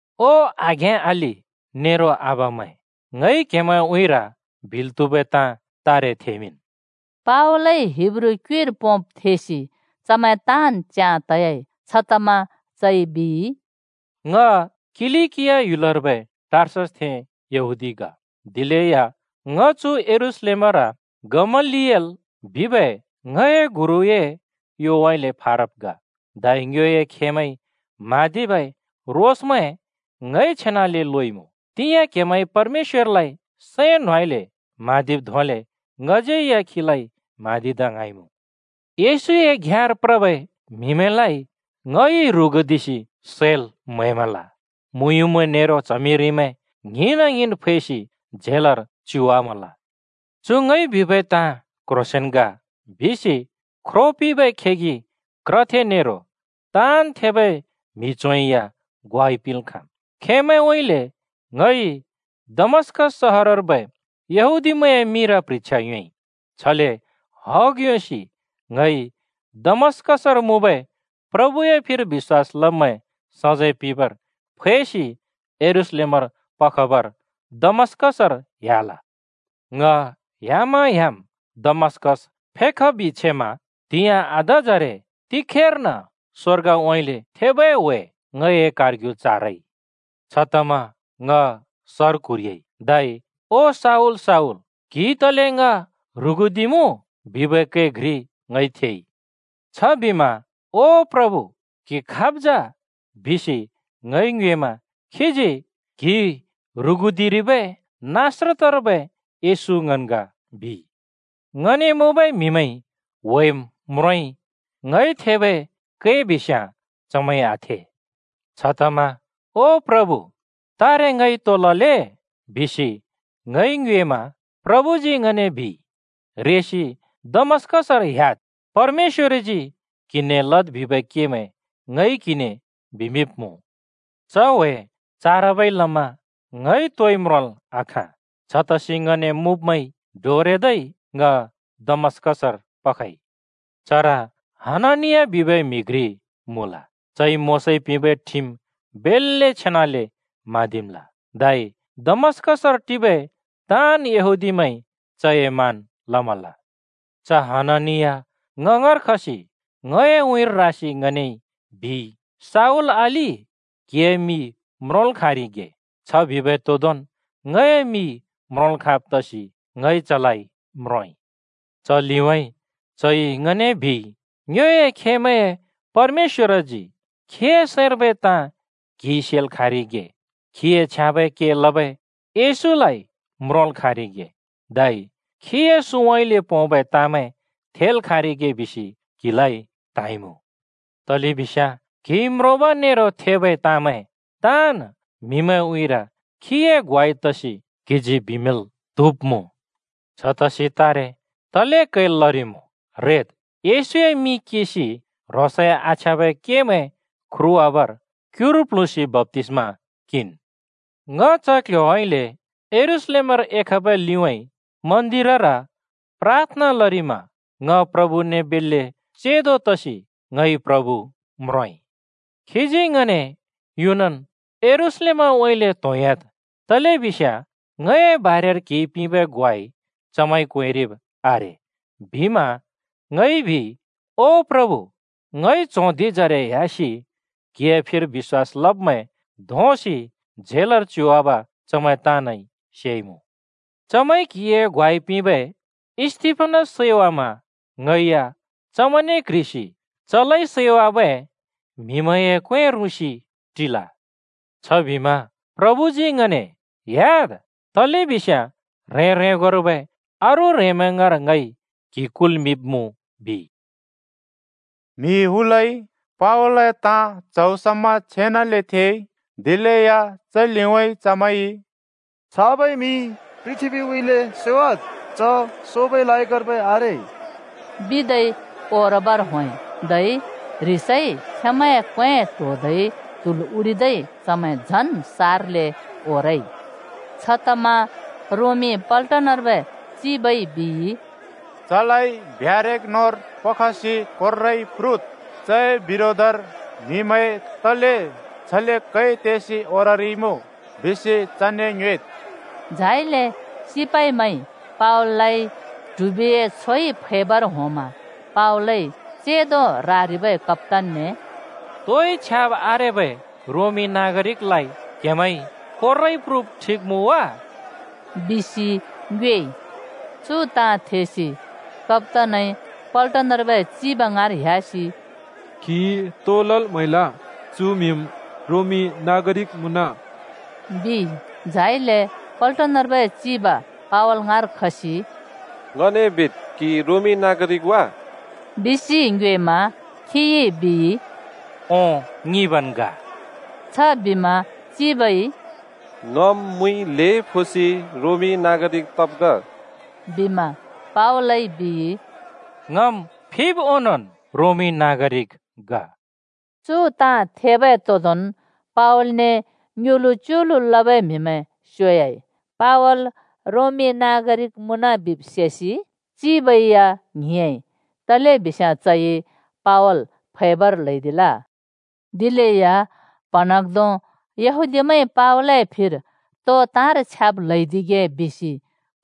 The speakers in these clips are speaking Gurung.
“ओ आघें-अलि नेरो आबामैं, ङइ क्हेमैंए उँइँर बिल् त्हुबै ताँ तारे थेमिंन्।” पावलइ हिब्रू क्युइर पोंब् थेसि चमैं ताँन् च्याँ तयाइ। छतमा चइ बिइ, “ङ किलिकिया ह्‍युलर्बै टार्ससथें यहूदी ग, दिलेया ङ चु यरूशलेमर गमलिएल बिबै ङए गुरुए योउँइँले फारब् ग। धै ङ्योए खेमैंइ म्हाँदिबै रोसमैं ङइ छेनाले लोइमुँ। तिंयाँ क्‍हेमैंइ परमेश्‍वरलाइ सैं न्होंउँइँले म्‍हाँदिब् धोंले ङज्‍यै या खीलाइ म्‍हाँदिदा ङ्हाँइँमुँ। येशूए घ्याँर प्रबै म्हिमैंलाइ ङइ ह्रुगुदिसि सैल् म्हैमल, मुँयुँमैं नेरो च्हमिरिमैं ङ्हिंना-ङ्हिंन् फैसि झेलर च्युवामल। चु ङइ बिबै ताँ क्ह्रोंसेंन् ग बिसि ख्रो पिंबै खेगि क्रथे नेरो ताँन् थेबै म्हि च्हों या ग्वाइ पिंल् खाँम्। खेंमैंउँइँले ङइ दमस्‍कस सहरर्बै यहूदीमैंए मिंर प्ह्रिछ्या योंइ। छले हग योंसि ङइ दमस्‍कसर मुँबै प्रभुए फिर बिश्‍वास लब्मैं सजैं पिंबर फैसि यरूशलेमर पखबर दमस्कसर ह्‍याल। “ङ ह्‍यामा-ह्‍याम् दमस्‍कस फेखबि छेमा त्हिंयाँ आधाजरे तिखेर्न स्वर्गउँइँले थेबै ह्‍वे ङए कारग्यु चारइ। छतमा ङ सर क्हुरिह्‍याइ, धै ‘ओ शाऊल, शाऊल, क्हिइ तले ङ ह्रुगुदिमुँ?’ बिबै कै घ्रि ङइ थेइ। “छबिमा ‘ओ प्रभु, क्हि खाब् जा?’ बिसि ङइ ङ्योएमा खीजी ‘क्हिइ ह्रुगुदिरिबै नासरतर्बै येशू ङन् ग,’ बिइ। ङने मुँबै म्हिमैंइ व्हेम् म्रोंइ, ङइ थेबै कै बिस्याँ चमैंइ आथे। “छतमा ‘ओ प्रभु, तारे ङइ तो लले?’ बिसि ङइ ङ्योएमा प्रभुजी ङने बिइ, ‘रेसि दमस्‍कसर ह्‍याद्, परमेश‍वरजी क्हिने लद् बिबै केमैं ङइ क्हिने बिमिंब्मुँ।’ च ह्‍वे चाराबै लमा ङइ तोइ म्रोंल् आखाँ। छतसि ङने मुँब्मैंइ डोरेदै ङ दमस्‍कसर पखइ। “चर हननिया बिबै म्‍हि घ्रि मुँल। चइ मोशाइ पिंबै ठिम बेल्‍ले छेनाले म्हाँदिमल। धै दमस्कसर टिबै ताँन् यहूदीमैंइ चए मान लमल। च हननिया ङ ङाँर खसि ङए उँइँर रासि ङने बिइ, ‘शाऊल अलि, क्हिए मि म्रोंल् खाँरिगे।’ छ बिबै तोंदोंन् ङए मि म्रोंल् खाँब् तसि ङइ चलाइ म्रोंइ। च लिउँइँ चइ ङने बिइ, ‘ङ्योए खेमैंए परमेश्‍वरजी खीए सैंर्बै ताँ क्हिइ सेल् खाँरिगे, खीए छ्याँबै के लबै येशूलाइ म्रोंल् खाँरिगे, धै खीए सुँउँइँले पोंबै ताँमैं थेल् खाँरिगे बिसि क्हिलाइ त्हाँइमुँ। तलेबिस्याँ क्हिइ म्रोंब नेरो थेबै ताँमैं ताँन् म्हिमैंए उँइँर खीए ग्वाइ तसि क्हिजी बिमिंल् त्हुब्मुँ। छतसि तारे तले क्हैल् लरिमुँ? रेद्! येशूए मिं किंसि ह्रोंसए आछ्याँबै केमैं ख्रुवाबर क्युर प्ल्हुँसि बप्‍तिस्मा किंन्।’ “च क्ल्ह्‍योउँइँले यरूशलेमर एखबै लिउँइँ मन्दिरर प्राथना लरिमा ङ प्रभुने बेल्‍ले चेंदो तसि ङइ प्रभु म्रोंइ। खीजी ङने, ‘युनन् यरूशलेमउँइँले त्होंह्‍याद्, तलेबिस्याँ ङए बारेर क्हिइ पिंबै ग्वाइ चमैंइ क्वेंरिब् आरे,’ बिमा ङइ बिइ, ‘ओ प्रभु, ङइ च्हों धिंजरे ह्‍यासि क्हिए फिर बिश्‍वास लब्मैं धोंसि झेलर च्युवाब चमैं ताँनइ सेइमुँ। चमैंइ क्हिए ग्वाइ पिंबै स्‍तिफनस सैवामा ङै या चमैंने क्ह्रिसि चलाइ सैवाबै म्हिमैंए क्वें रुँसि टिल।’ छबिमा प्रभुजी ङने ‘ह्‍याद्, तलेबिस्याँ ह्रें-ह्रेंगोर्बै अरू ह्रेंमैं ङाँर ङइ क्हि कुल्मिंब्मुँ,’ बिइ।” म्हि हुलइ पावलए ताँ च्हौ समा छेनाले थेइ। दिलेया च लिउँइँ चमैइ “छाबै म्हि पृथ्‍बीउँइँले स्योवाद्। च सोबै लायकर्बै आरे,” बिदै ओरबर होंइ। धै ह्रिसइ खेंमैंए क्वें ट्होदै त्हुल् उडिदै चमैं झन् सारले ओरइ। छतमा रोमी पलटनर्बै चिबइ बिइ, “चलाइ ब्यारेक न्होंर पखसि कोर्राइ प्रुद्। चए बिरोधर म्हिमैं तले छले कै तेसि ओररिइमुँ बिसि चने ङयोएद्।” झाइले सिपाइमैंइ पावललाइ ट्हिबिए छोइ फैबर होंमा पावलइ चेंदो रारिबै कप्‍तानने “तोइ छ्याब् आरेबै रोमी नागरिकलाइ क्हेमैंइ कोर्राइ प्रुब ठिक मुँ वा?” बिसि ङ्योएइ। चु ताँ थेसि कप्‍तानइ पल्टनर्बै चिब ङाँर ह्‍यासि “क्हिइ तो लल् म्हैल? चु म्हिम् रोमी नागरिक मुँन,” बिइ। झाइले पल्टनर्बै चिब पावल ङाँर खसि “ङने बिद्, क्हि रोमी नागरिक वा?” बिसि ङ्योएमा खिइ बिइ, “ओं, ङिंबन् ग।” छबिमा चिबइ “ङम् मुइ ल्हें फोसि रोमी नागरिक तब् ग,” बिमा पावलइ बिइ, “ङम् फिब् ओंनोंन् रोमी नागरिक ग।” चु ताँ थेबै तोंदोंन् पवालने ङ्युलु-च्युलु लबै म्हिमैं स्योयाइ। पावल रोमी नागरिक मुँन बिब् सेसि चिबै या ङ्हिंयाँइ, तलेबिस्याँ चइ पावल फैबर ल्हैदिल। दिलेया प्हँन्हाँग्धों यहूदीमैंइ पावलए फिर तो ताँर छ्याब् ल्हैदिगे बिसि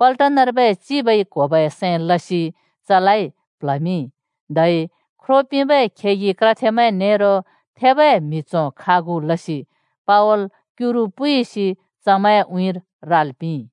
पल्टनर्बै चिबइ क्होबै सैं लसि चलाइ प्ल्हमिंइ, धै ख्रो पिंबै खेगि क्रथेमैं नेरो थेबै म्हि च्हों खागु लसि पावल क्युरु पुइसि चमैंए उँइँर राल् पिंइ।